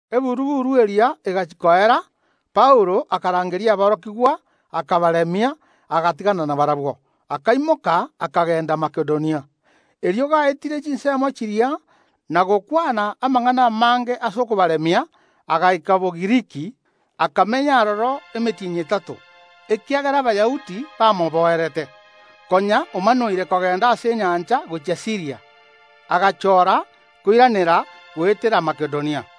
Eburu‐buru eria egachia koera, Paulo akarangeria aborokigwa, akabaremia, agatigana nabarabwo, akaimoka akagenda Makedonia. Erio gaetire chinsemo chiria na gokwana amang’ana amange ase okobaremia, agaika Bogiriki. Akamenya aroro emetienyi etato. Ekiagera Abayahudi bamoboerete, konya omanoire kogenda ase enyancha gochia Siiria, agachoora koiranera goetera Makedonia.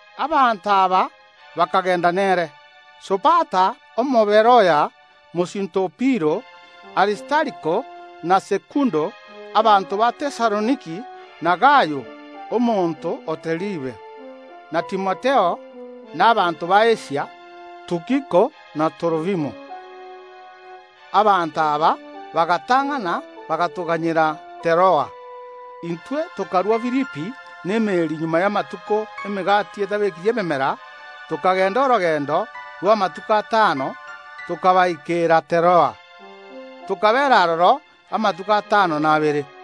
Abanto aba bakagenda nere: Sopater Omoberoya, mosinto o Piro, Aristariko na Sekundo, abanto ba Tesaloniki, na Gayo, omonto o Deribe, na Timotheo, na abanto b’Asia, Tukiko na Torofimo. Abanto aba bagatang’ana, bagatoganyera Teroa. Intwe tokarua Filipi n’emeeri magega y’amatuko y’Emegati etabekiri memera, tokagenda orogendo rw’amatuko atano, tokabaikeera Teroa. Tokabeera aroro amatuko atano na abere.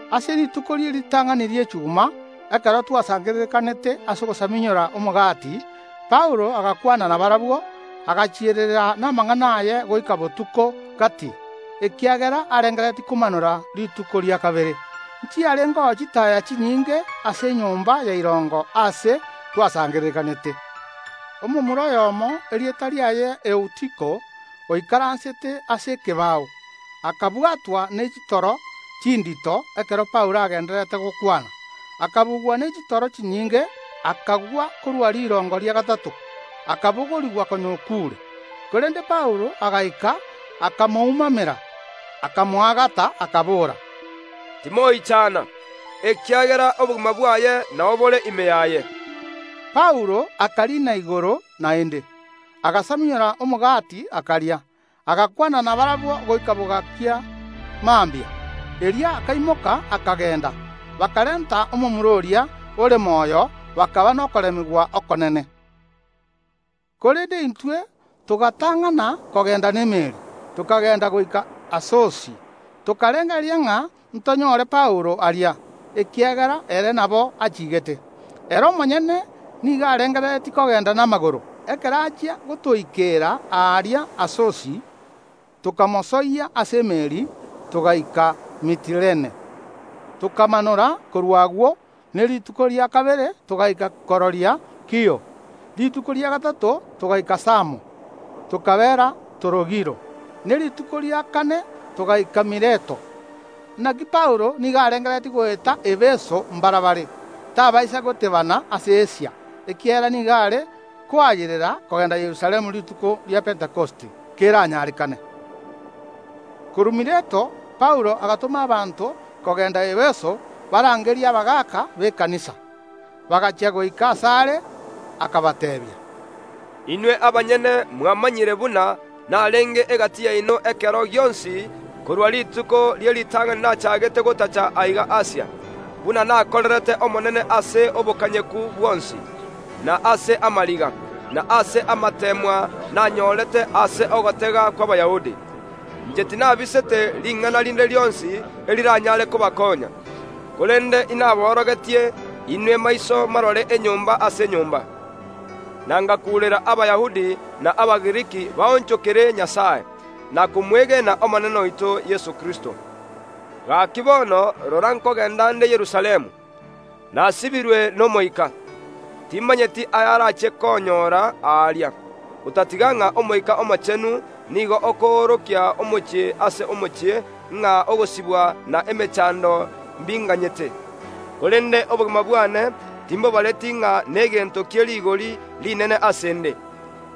Ase rituko rie ritang’ani ri’echuma, ekero twasangererekanete ase ogosamunyora omogati, Paulo agakwana nabarabwo, agachiererera namang’ana aye goika botuko gati, ekiagera arengereretie komanora rituko ria kabere. Nchiarengeo chitaaya chinyinge ase enyomba ya irongo aase twasangererekanete. Omomura oyomo, erieta riaye Eutiko, oikaransete ase ekebao, akabwatwa ne chitoro chindito ekero Paulo agendererete gokwana; akabugwa ne chitoro chinyinge akagwa korwa rirongo ria gatato, akabogorigwa konya okuure. Korende Paulo agaika, akamoumamera, akamoagata, akabora: “Timoichana, ekiagera obogima bwaye nao bore ime yaye.” Paulo akariina igoro naende, agasamunyora omogati akaria, agakwana nabarabwo goika bogakia mambia. Erio akaimoka, akagenda. Bakarenta omomura oria, ore moyo, bakaba nokoremigwa okonene. Korende intwe togatang’ana kogenda n’emeeri, tokagenda goika Asosi. Tokarengereria ng’a ntonyore Paulo aria, ekiagera ere nabo achiigete. Ere omonyene nigo arengereretie kogenda namagoro. Ekero achia gotoikeera aaria Asosi, tokamosoyia ase emeeri, togaika Metilene. Tokamanora korwa agwo, ne rituko ria kabere togaika kororia Kio. Rituko ria gatato togaika Samo, tokabeera Torogilo, ne rituko ria kane togaika Mileto. Naki Paulo nigo arengereretie goeta Efeso mbarabare, tabaisa goteebana ase Asia, ekiagera nigo are koayerera kogenda Yerusalemu rituko ria Pentekosti, keranyarekane. Korwa Mileto Paulo agatoma abanto kogenda Efeso barangerie abagaaka b’ekanisa. Bagachia goika asare, akabateebia. “Inwe abanyene mwamanyire buna narenge egati yaino ekero gionsi korwa rituko rie ritang’ani nachaagete gotacha aiga Asia, buna nakorerete Omonene ase obokanyeku bwonsi, na ase amariga, na ase amateemwa nanyorete ase ogotega kw’Abayahudi. Inche tinabisete ring’ana rinde rionsi eriranyare kobakonya, korende inaborogetie inwe maiso marore enyomba ase enyomba, na ngakuurera Abayahudi na Abagiriki baonchokere Nyasae, na komwegen’Omonene oito Yeso Kristo. Gaki bono rora, nkogenda nde Yerusalemu, nasibirwe n’Omoika. Timanyeti ayarachie konyoora aaria, otatiga ng’a Omoika Omochenu nigo okoorokia omochie ase omochie ng’a ogosibwa na emechando mbinganyete. Korende obogima bwane timbobareti ng’a negento kie rigori rinene ase ’nde,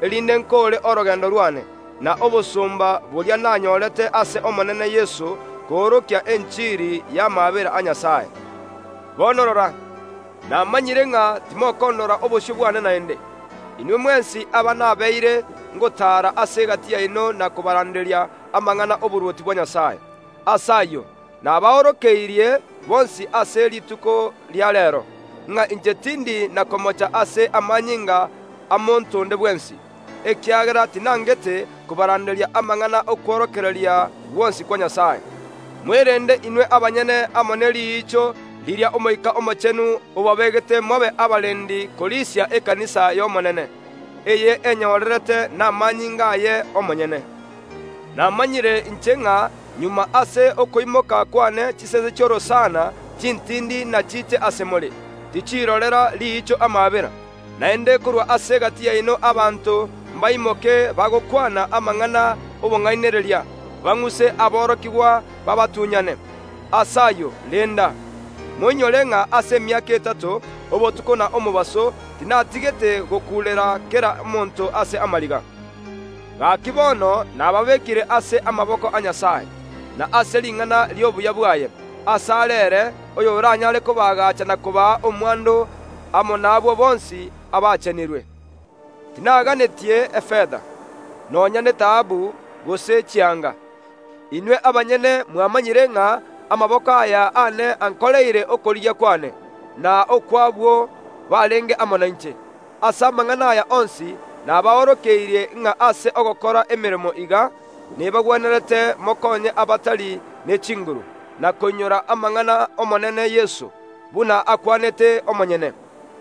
erinde nkoore orogendo rwane, na obosomba boria nanyorete ase Omonene Yeso koorokia enchiri y’amaabera a Nyasae. Bono rora, namanyire ng’a timokondora obosio bwane naende, inwe mwensi aba nabeire ngotaara ase egati yaino na kobaranderia amang’ana ’oborwoti bwa Nyasae. Ase ayio nabaorokeirie bonsi ase rituko ria reero, ng’a inche tindi na komocha ase amanyinga a monto onde bwensi, ekiagera tinangete kobaranderia amang’ana ’okworokereria gwonsi kwa Nyasae. Mwerende inwe abanyene amo ne riicho riria Omoika Omochenu obabegete mobe abarendi korisia ekanisa ya Nyasae, eye enyorerete namanyinga aye omonyene. Namanyire inche ng’a magega ase okoimoka kwane chisese chi’orosana chintindi nachiche ase more, tichirorera riicho amaabera, naende korwa ase egati yaino abanto mbaimoke bagokwana amang’ana ’obong’ainereria, bang’use aborokigwa babatunyane. Ase ayio renda, moinyore ng’a ase emiaka etato, obotuko na omobaso, tinatigete gokuurera kera omonto ase amariga. Gaki bono nababekire ase amaboko a Nyasae, na ase ring’ana ri’obuya bwaye, asare ere oyoranyaare kobaagacha na kobaa omwando amo nabwo bonsi abachenirwe. Tinaganetie efeta, nonya netaabu gose chianga. Inwe abanyene mwamanyire ng’a amaboko aya aane ankoreire okorigia kwane, na okw’abwo barenge amo nainche. Ase amang’ana aya onsi nabaorokeirie ng’a ase ogokora emeremo iga, nebagwenerete mokonye abatari ne chinguru, na koinyora amang’ana ’Omonene Yeso, buna akwanete omonyene: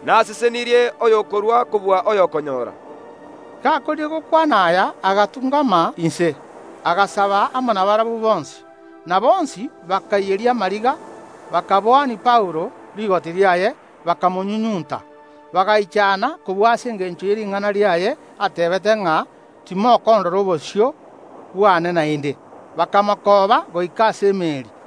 Nasesenirie oyokorua kobua oyokonyoora.” Gakoorire gokwana aya agatung’ama inse, agasaba amo nabarabwo bonsi. Na bonsi bakaiyeria amariga, bakaboania Paulo rigoti riaye, bakamonyunyunta. Bagaichana kobua ase engencho ye ring’ana riaye, ateebete ng’a: “Timokondora obosio bwane naende.” Bakamokooba goika ase emeeri.